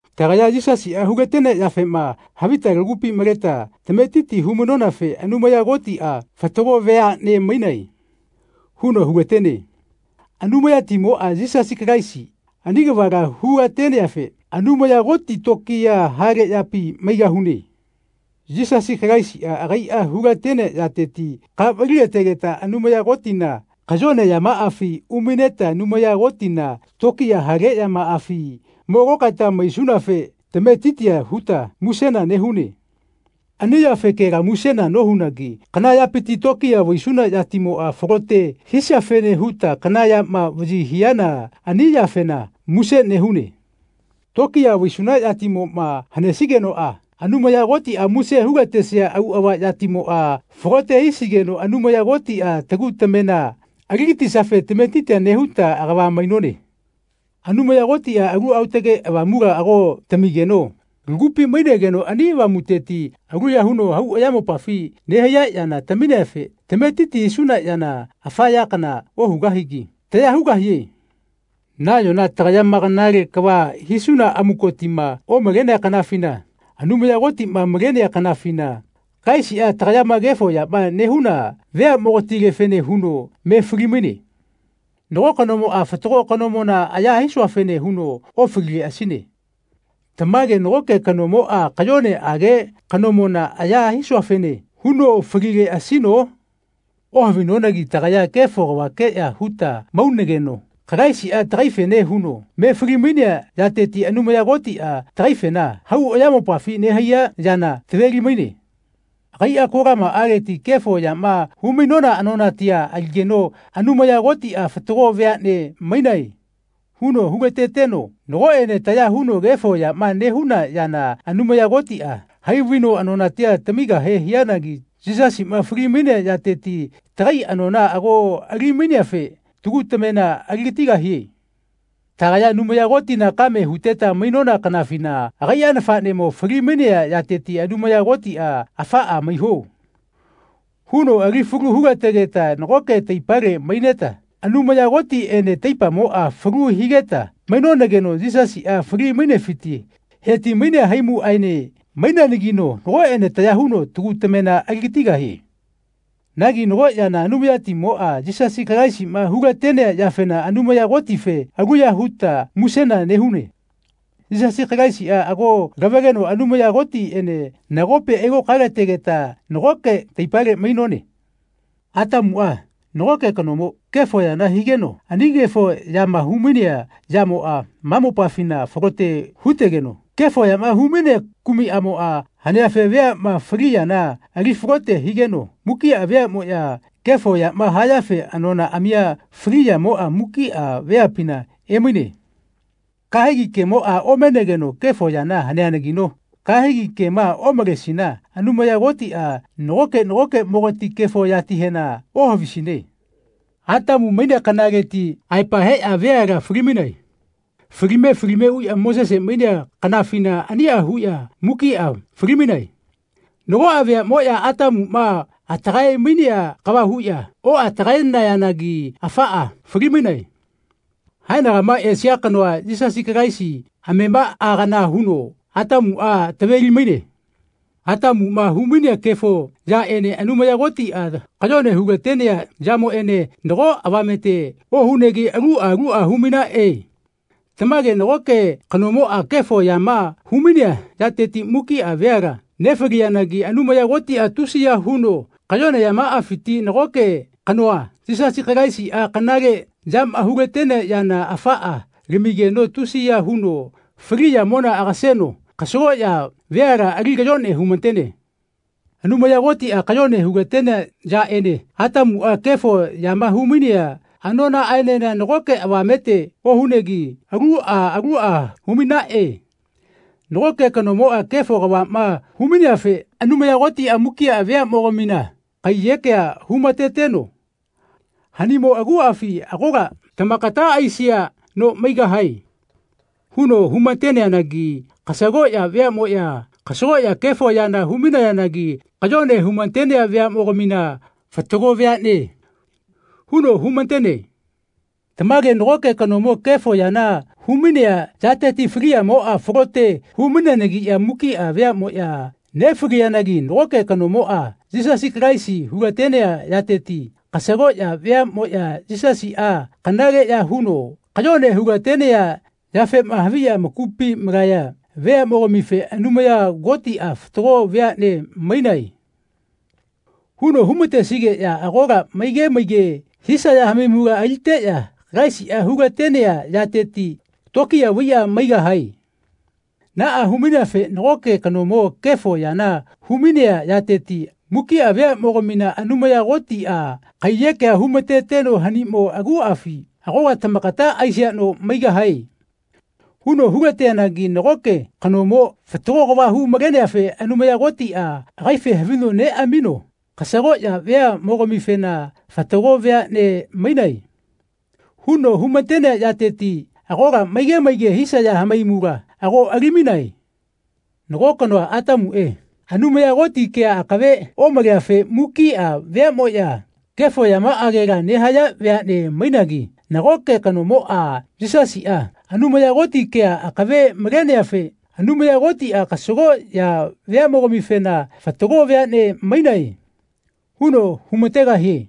Tagaya Yisasiꞌa hulatenea yafema havita tagupi maleta tametiti humainonafe Anumaya Kotiꞌa “Fatago veaꞌne mainae.” huno hulatene. Anumayatimoꞌa, Yisasi Kalaisi, ani kavala hulateneafe Anumaya Koti tokiya hale yapi maigahune. Yisasi Kalaisiꞌa agaiꞌa hulatenea yateti ka valilategeta Anumaya Kotina kayone yamaꞌafi umaineta Anumaya Kotina tokiya hale yamaꞌafi mo lokaeta maisunafe tametitia huta musena nehune. Ani yafekela musena nohunagi kana yapiti tokiya vaisuna yatimoꞌa falote hisiafene huta kana yama vaꞌyi hiana ani yafena muse nehune. Tokiya vaisuna yatimoꞌma hanesigenoꞌa Anumaya Kotiꞌa muse hulatesia auꞌava yatimoꞌa falote hisigeno Anumaya Kotiꞌa tagu tamena aligatisiafe tametitia nehuta agava mainone. Anumaya Kotiꞌa Alu Aotage Avamula ago tamigeno lagupi mainegeno ani Avamuteti aluya huno hau ayamopafi nehaiya yana tamineafe tametiti hisuna yana afa ya kana ohugahigi taya hugahie. Nayona tagayama kanale kava hisuna amukotima omalenea kanafina, Anumaya Kotiꞌma malenea kanafina, Kalaisiꞌa tagayama kefo yama nehuna veaꞌmogatilefene huno me falimaine. Nago kanomoꞌa fatago kanomona aya hisuafene huno ofalileꞌasine. Tamage nagoke kanomoꞌa kayoneꞌage kanomona aya hisuafene huno falileꞌasino? Ohavinonagi tagaya kefo kavakeꞌya huta maunageno Kalaisiꞌa tagaifene huno me falimainea yateti Anumaya Kotiꞌa tagaifena hau ayamopafi nehaiya yana taveli-maine. Agaiꞌa kolamaꞌaleti kefo yama humainona anonatia aligeno Anumaya Kotiꞌa “Fatago veaꞌne mainae.” huno hulateteno nagoꞌene taya huno kefo yama nehuna yana Anumaya Kotiꞌa hai vaino anonatia tamigahe hianagi Yisasiꞌma falimainea yateti tagai anona ago alimaineafe tagu tamena aligatigahie. Tagaya Anumaya Kotina kame huteta mainona kanafina agaiꞌa nafaꞌnemo falimainea yateti Anumaya Kotiꞌa “Afaꞌa maiho.” huno ali falu hulategeta nagoke taipale maineta Anumaya Kotiꞌene taipamoꞌa falu higeta mainonageno Yisasiꞌa fali-mainefiti heti-mainea haimuꞌaene maineanagino nagoꞌene taya huno tagu tamena aligatigahie. Nagi nago yana Anumayatimoꞌa, Yisasi Kalaisiꞌma hulatenea yafena Anumaya Kotife aluya huta musena nehune. Yisasi Kalaisiꞌa ago lavaleno Anumaya Kotiꞌene nagopi ailokaelategeta nagoke taipale mainone. Atamuꞌa, nagoke kanomo, kefo yana higeno ani kefo yama humainea yamoꞌa ma mopafina falote hutegeno kefo yama humainea kumiꞌamoꞌa haneafe veaꞌma fali yana alifalote higeno mukiꞌa veaꞌmoꞌya kefo yama hayafe anonaꞌamia fali yamoꞌa mukiꞌa veapina emaine. Kahegi kemoꞌa omenegeno kefo yana haneanagino kahegi kema omalesina Anumaya Kotiꞌa nagoke nagokeꞌmogati kefo yatihena ohavisine. Atamu mainea kanaleti aepa heꞌya veala falimainae. Falime falime uꞌya Mosese mainea kanafina aniꞌa huꞌya mukiꞌa falimainae. Nagoꞌa veaꞌmoꞌya Atamuꞌma atagae-mainea kava huꞌya oꞌatagaenayanagi afaꞌa falimainae. Haenagama esia kanoa Yisasi Kalaisi amemaꞌa kana huno Atamuꞌa taveli-maine. Atamuꞌma humainea kefo yaꞌene Anumaya Kotiꞌa kayone hulatenea yamoꞌene nago avamete ohunegi aluꞌa luꞌa humainaꞌe. Tamage nagoke kanomoꞌa kefo yama humainea yateti mukiꞌa veala nefaliyanagi Anumaya Kotiꞌa tusi ya huno kayone yamaꞌafiti nagoke kanoa, Yisasi Kalaisiꞌa, kanale yama hulatenea yana afaꞌa lamigeno tusiya huno fali yamona agaseno kasagoꞌya veala ali kayone humatene. Anumaya Kotiꞌa kayone hulatenea yaꞌene Atamuꞌa kefo yama humainea anonaꞌaenena nago avamete ohunegi aluꞌa luꞌa humainaꞌe. Nagoke kanomoꞌa kefo kavaꞌma humaineafe Anumaya Kotiꞌa mukiꞌa veaꞌmogamina kaiyekea humateteno “Hanimo aguꞌafi agola tamakata aisia no maigahae.” huno humateneanagi kasagoꞌya veaꞌmoꞌya kasagoꞌya kefo yana humainayanagi kayone humatenea veaꞌmogamina “Fatago veaꞌne.” huno humatene. Tamage nagoke kanomo kefo yana humainea yateti faliyamoꞌa falote hu-maineanagiꞌya mukiꞌa veaꞌmoꞌya nefaliyanagi nagoke kanomoꞌa, Yisasi Kalaisi, hulatenea yateti kasagoꞌya veaꞌmoꞌya Yisasiꞌa kanale ya huno kayone hulatenea yafema haviꞌya amakupi malaya veaꞌmogamife Anumaya Kotiꞌa “Fatago veaꞌne mainae.” huno hu-matesigeꞌya agola maige maige hisaya hamaimula aliteꞌya Kalaisiꞌa hulatenea yateti tokiya vaiꞌya maigahae. Naꞌa humaineafe nagoke kanomo kefo yana humainea yateti mukiꞌa veaꞌmogamina Anumaya Kotiꞌa kaiyekea humateteno “Hanimo aguꞌafi agola tamakata aisia no maigahae.” huno hulateanagi nagoke kanomo fatago kava hu-maleneafe Anumaya Kotiꞌa agaife havino neꞌamino kasagoꞌya veaꞌmogamifena “Fatago veaꞌne mainae.” huno humatenea yateti agola maige maige hisaya hamaimula ago alimainae. Nago kanoa, Atamuꞌe, Anumaya Koti kea akave omaleafe mukiꞌa veaꞌmoꞌya kefo yamaꞌagela nehaya veaꞌne mainagi nagoke kanomoꞌa, Yisasiꞌa, Anumaya Koti kea akave maleneafe Anumaya Kotiꞌa kasagoꞌya veaꞌmogamifena “Fatago veaꞌne mainae.” huno humategahie.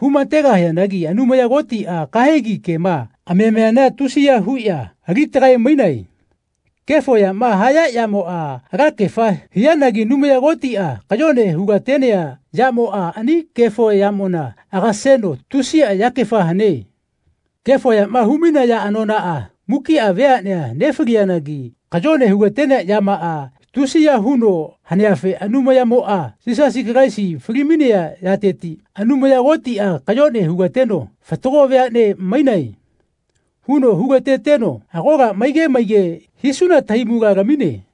Hu-mategahianagi Anumaya Kotiꞌa kahegi kema amamiana tusiya huꞌya alitagae-mainae. Kefo yama haya yamoꞌa alakefa hianagi Anumaya Kotiꞌa kayone hulatenea yamoꞌa ani kefo yamona agaseno tusiꞌa yakefa hane. Kefo yama humainaya anonaꞌa mukiꞌa veaꞌnea nefaliyanagi kayone hulatenea yamaꞌa tusiya huno haneafe Anumayatimoꞌa, Yisasi Kalaisi falimainea yateti Anumaya Kotiꞌa kayone hulateno “Fatago veaꞌnea mainae.” huno hulateteno agola maige maige hisuna tahaimula lamine.